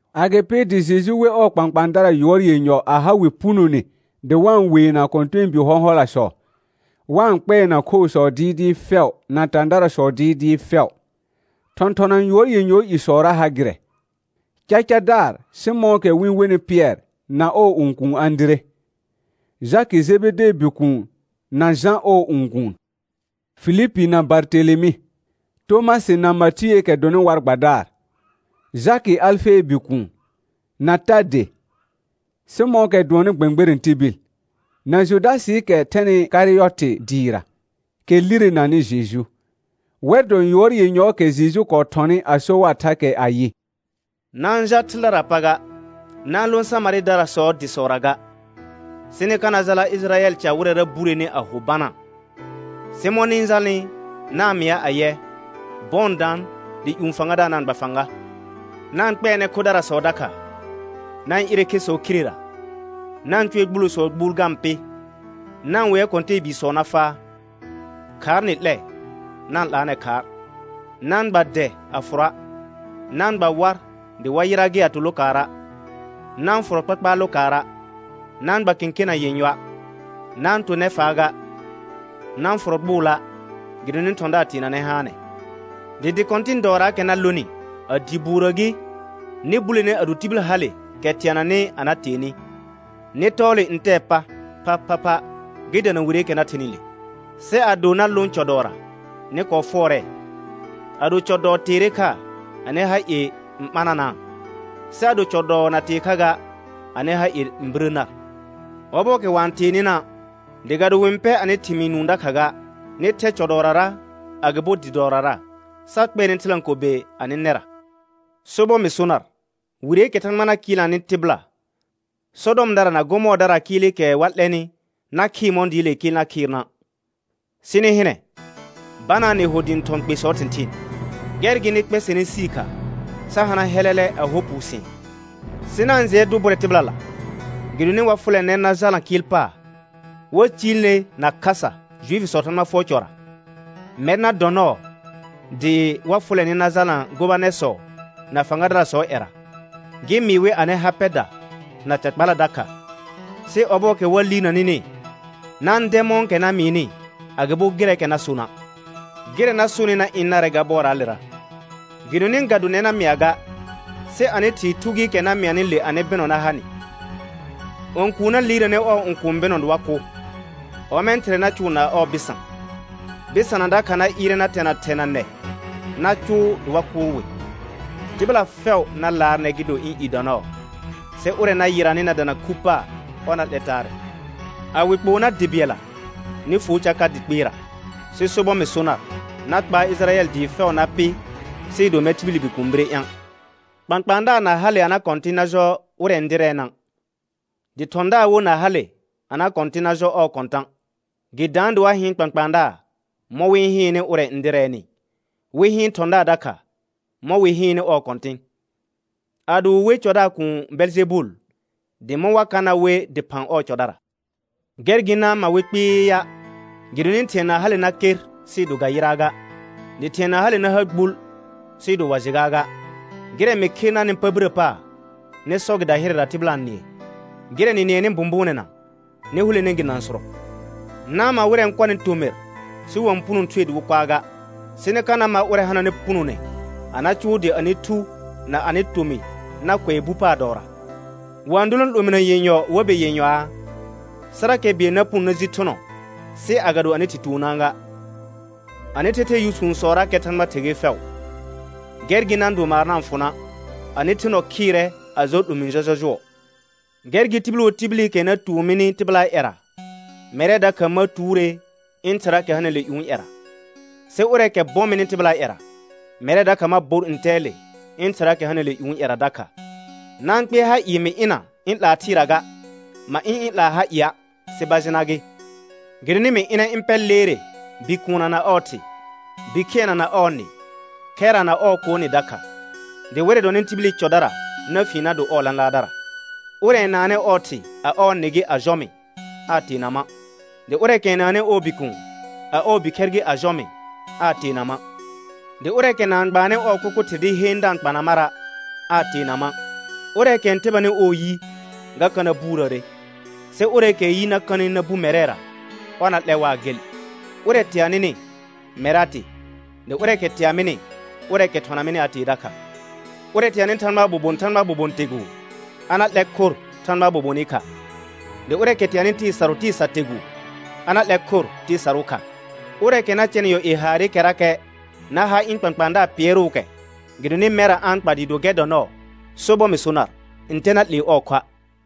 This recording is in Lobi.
Agɩpɩ dɩ Jeju we ɔɔ kpãkpãadara yʋɔr yenyɔ a ha wɩ punone dɩ wa-n weena kɔ̃tɛɛbi hɔ̃hɔlasɔ, wa-n kpɛɛna khoosɔ dɩɩdɩɩ fɛʋ na tãdarasɔ dɩɩdɩɩ fɛʋ. Thɔ̃thɔna yʋɔr yenyɔɔ isɔra ha gɩrɛ: Gacadaar Sɩmɔ̃ɔkɛ wɩ-n wenɩ Pɩɛr na ɔɔ õkuun Ãdire, Jakɩ Jebedee bikuun na Jã ɔɔ õkuun, Filipi na Bartelemɩ, Tomasɩ na Matiəəkɛ dɔnɩ war gbadaar, Jakɩ Alfee bikuun, na Tade, Sɩmɔ̃ɔkɛ dʋɔnnɩ gbɛ̃gbɛrɛ̃ tibil, na Judasɩɩkɛ thɛnɩ Karɩyɔtɩ dɩɩra, kɛ lirenanɩ Jeju. Wɛr dɔ yʋɔr yenyɔɔkɛ Jeju kɔɔ thɔnɩ a so war thakɛ ayɩ: Na-n jal thɩldaraa pa ga, na-n lõ Samarɩdarasɔɔ dɩsɔra ga. Sɩ nɩ ka na jala Ɩjɩrayɛl ca wɩrɛra bureni a ho banaa. Sɩ mɔ̃ nɩ-n jalnɩ na-n mɩa ayɛ, bɔɔ n daan dɩ ƴũ Fãgadaar na-n gba fãga. Na-n kpɛɛnɛ khodarasɔ dakha, na-n ɩrɛ khesɔ khirera, na-n cʋɛ gbulosɔɔ gbuul ga-n pɩ, na-n wea kɔ̃tɛɛbiisɔ na faa. Khaar nɩ 'lɛ, na-n 'laanɛ khaar. Na-n gba dɛ a fʋrɔa', na-n gba war dɩ war yɩra gɩ a to lokaara'; na-n fʋrɔ kpakpaar lokaara', na-n gba kẽkena yenyɔa', na-n to nɛfaa ga, na-n fʋrɔ gbʋʋla', gɩdonɩ thɔ̃daar teenanɛ haanɛ. Dɩ dɩ kɔ̃tɩ̃ dɔɔraakɛ na lonɩ, a dɩ buurə gɩ, nɩ bulene ado tibil hale kɛ teananɩ a na tee nɩ. Nɩ tɔɔ le ntɛɛ pa phaphapha gɩ dana wireekɛ na thenɩ le. Sɩ ado na lõ cɔ dɔɔra, nɩ kɔɔ fʋɔrɛɛ. Ado cɔ dɔɔ teere kha, anɩ ha ie n ɓananaa, sɩ ado cɔ dɔɔ na tee kha ga, anɩ ha ie n birə nar. Ɔbɔɔkɛ wa-n tee nɩna', dɩ ga do wɩ-n pɛ anɩ thɩmɩɩ nũu dakha ga, nɩ thɛ cɔ dɔɔrara agɩbo dɩ dɔɔrara, sa kpɛɛnɛ thɩlãkobe anɩ nɛra. Sobɔr mɩ so nar, wireekɛ Thãgba na kɩɩlnanɩ tɩbɩla, Sɔdɔmdara na Gɔmɔɔrdaraa kɩɩlɩkɛ wa 'lɛnɩ na khɩɩr mɔ̃ dɩɩlee kɩɩl na khɩɩrna'. Sɩ nɩ hɩnɛ, banaa nɩ ho dɩ ɩ̃ thɔ̃ kpesɔɔ thɩ̃thɩɩn; gɛr gɩ nɩ kpɛsɛnɛ sii kha sa hana hɛlɛlɛ a hɔ puusɩ̃ɛ. Sɩ na-n jɩɛ dʋ bʋrɛ tɩbɩlala, gɩdonɩ wa fʋlɛ nɛr na jalna kɩɩl paar, wa ciil ner na khasa Juifisɔɔ Thãgba fʋɔr cɔra. Mɛr na dɔ nɔɔ dɩ̃ wa fʋlɛ nɩ na jalna gobanɛrsɔ na fãgadarasɔɔ ƴɛra, gɩ mɩɩ wɩ anɩ ha pɛda na ca kpala dakha. Sɩ ɔbɔɔkɛ wa liirna nɩnɩ, na-n dɛ mɔ̃kɛ na mɩɩnɩ, agɩbo gɩrɛɛkɛ na sona'. Gɩrɛ na sonɩ na ɩ̃ narɛ ga bɔraalera. Gɩdonɩ ga do nɛr na mɩa ga, sɩ anɩ Thɩɩ Thu gɩɩkɛ na mɩanɩ le anɩ bɩnɔ na ha nɩ. õkuun na liirnanɛ ɔɔ õkũu bɩnɔ dɩ wa kʋ; ɔmɛ̃ thɩrɛ na cʋʋ na ɔɔ bɩsã. Bɩsana dakha na ɩɩrɛ na tɛna thɛ na nɛ na cʋʋ dɩ wa kʋʋr wɩ. Tɩbɩla fɛʋ na laar nɛr, gɩ do ɩ̃ i dɔ nɔɔ, sɩ ʋrɛ na yɩranɩ na dana khu paar, ɔr na 'lɛ taarɛ. A wɩ kpoo nar dɩ bɩɛlla, nɩ fuo ca ka dɩ kpɩɩra. Sɩ sobɔr mɩ so nar, na kpaar Ɩjɩrayɛl dɩɩ fɛʋ na pɩ sɩɩ do mɛr tibili Bikuun bire ɩ̃a'. Kpãkpãadaar na hale a na kɔ̃tɩ̃ na jɔ ʋrɛ n dɩrɛɛna', dɩ thɔ̃daar wo na hale a na kɔ̃tɩ̃ na jɔ ɔɔ kɔ̃tã'. Gɩ daan dɩ wa hɩɩn kpãkpãadaar mɔ̃ wɩ-n hɩɩnnɩ ʋrɛ n dɩrɛɛnɩ, wɩ hɩɩn thɔ̃daar dakha mɔ̃ wɩ hɩɩnnɩ ɔɔ kɔ̃tɩ̃. Ado wɩ we cɔdaar kuun Bɛljɛbul, dɩ mɔ̃ wa ka na we dɩphã ɔɔ cɔdara? Gɛr gɩ na-n ma wɩ kpɩɩa', gɩdonɩ thɩ̃ɛ na hale na ker sɩɩ do ga yɩraa ga, dɩ thɩ̃ɛ na hale na ha gbul sɩɩ do wa jɩ gaaga. Gɩrɛ mɩ khe narnɩ pa birə paar, nɩ sɔ gɩ dahɩrɛra tɩbɩla n nɩɛ. Gɩrɛ nɩ nɩɛnɩ bʋ̃bʋʋnɛna, nɩ hulene gi nãsʋrɔ. Na-n ma wɩrɛ n kɔnɩ tomɩr, sɩ wa-n puno thue dɩ wɩ kʋaa ga, sɩ nɩ ka na ma ʋrɛ hananɩ punone a na cʋʋ dɩ anɩ thu na anɩ tomɩ na kʋɛ bu paar dɔɔra. Wa-n dolõ 'lominə yenyɔ war be yenyɔaa? Sɩrakɛ bɩɛl na puno na ji thʋnɔ, sɩ agado anɩ Thɩ tuonaa ga. Anɩ thɛthɛɛ yʋsũsɔrakɛ Thãgba ther ger fɛʋ. Gɛr gɩ na-n do maar na-n fʋ na', anɩ the nɔ khɩɩrɛ a jɔ 'lomĩ jɔjɔjʋɔ. Gɛr gɩ tibil wo tibilikɛ na tuon mini tɩbɩlaa ƴɛra, mɛrɛ dakha ma tuure ɩ̃ Thɩraakɛ hanɩle ƴũu ƴɛra. Sɩ ʋrɛɛkɛ bɔ mɩnɩ tɩbɩlaa ƴɛra, mɛrɛ dakha ma bor ntɛɛle ɩ̃ Thɩraakɛ hanɩle ƴũu ƴɛra dakha. Na-n kpɩɛr ha ɩɩ mɩ ɩna ɩ̃ 'laa thɩɩra ga. Ma ɩ̃ ɩ̃ 'laa ha ɩa', sɩ bajɩna gɩ. Gɩdonɩ mɩ ɩnɛ ɩ̃ pɛr leere bikuunna na ɔɔ thɩ, bikhɩɛnna na ɔɔ nɩ, khɛrra na ɔɔ koo nɩ dakha, dɩ wɩrɛ dɔnɩ tibili cɔdara na fien na do ɔɔ lãlaardara. Ʋrɛ n naannɩ ɔɔ thɩ, a ɔɔ nɩ gɩ, a jɔ mɩ aa teena ma'; dɩ ʋrɛɛkɛ n naannɩ ɔɔ bikuun, a ɔɔ bikhɛr gɩ, a jɔ mɩ aa teena ma'. Dɩ ʋrɛɛkɛ na-n gbaannɩ ɔɔ kʋkʋ thɩr dɩ heen da-n kpana mara', aa teena ma'. Ʋrɛɛkɛ n tɛbanɩ ɔɔ yi, ga ka na buurəəre, sɩ ʋrɛɛkɛɛ yi na kanɩ na bu mɛrɛra, ɔr na lɛ waa gel. Ʋrɛ tea nɩnɩ, mɛr a tee, dɩ ʋrɛɛkɛ tea mɩnɩ, ʋrɛɛkɛ thɔna mɩnɩ a tee dakha. Ʋrɛ teanɩ Thãgbaa bobon Thãgbaa bobon teguu, a na 'lɛr khor Thãgbaa bobonɩ kha; dɩ ʋrɛɛkɛ teanɩ tɩɩ sarʋ tɩɩ sar teguu, a na 'lɛr khor tɩɩ sarʋʋ kha. Ʋrɛɛkɛ na cɛnɩ yɔ ie haarɩkɛrakɛ na ha ɩ̃ kpãkpãadaar pɩɛrʋʋkɛ, gɩdonɩ mɛrra a-n kpa dɩɩ do gɛr dɔ nɔɔ, sobɔr mɩ so nar, ntɛ na 'lee ɔɔ khoa'.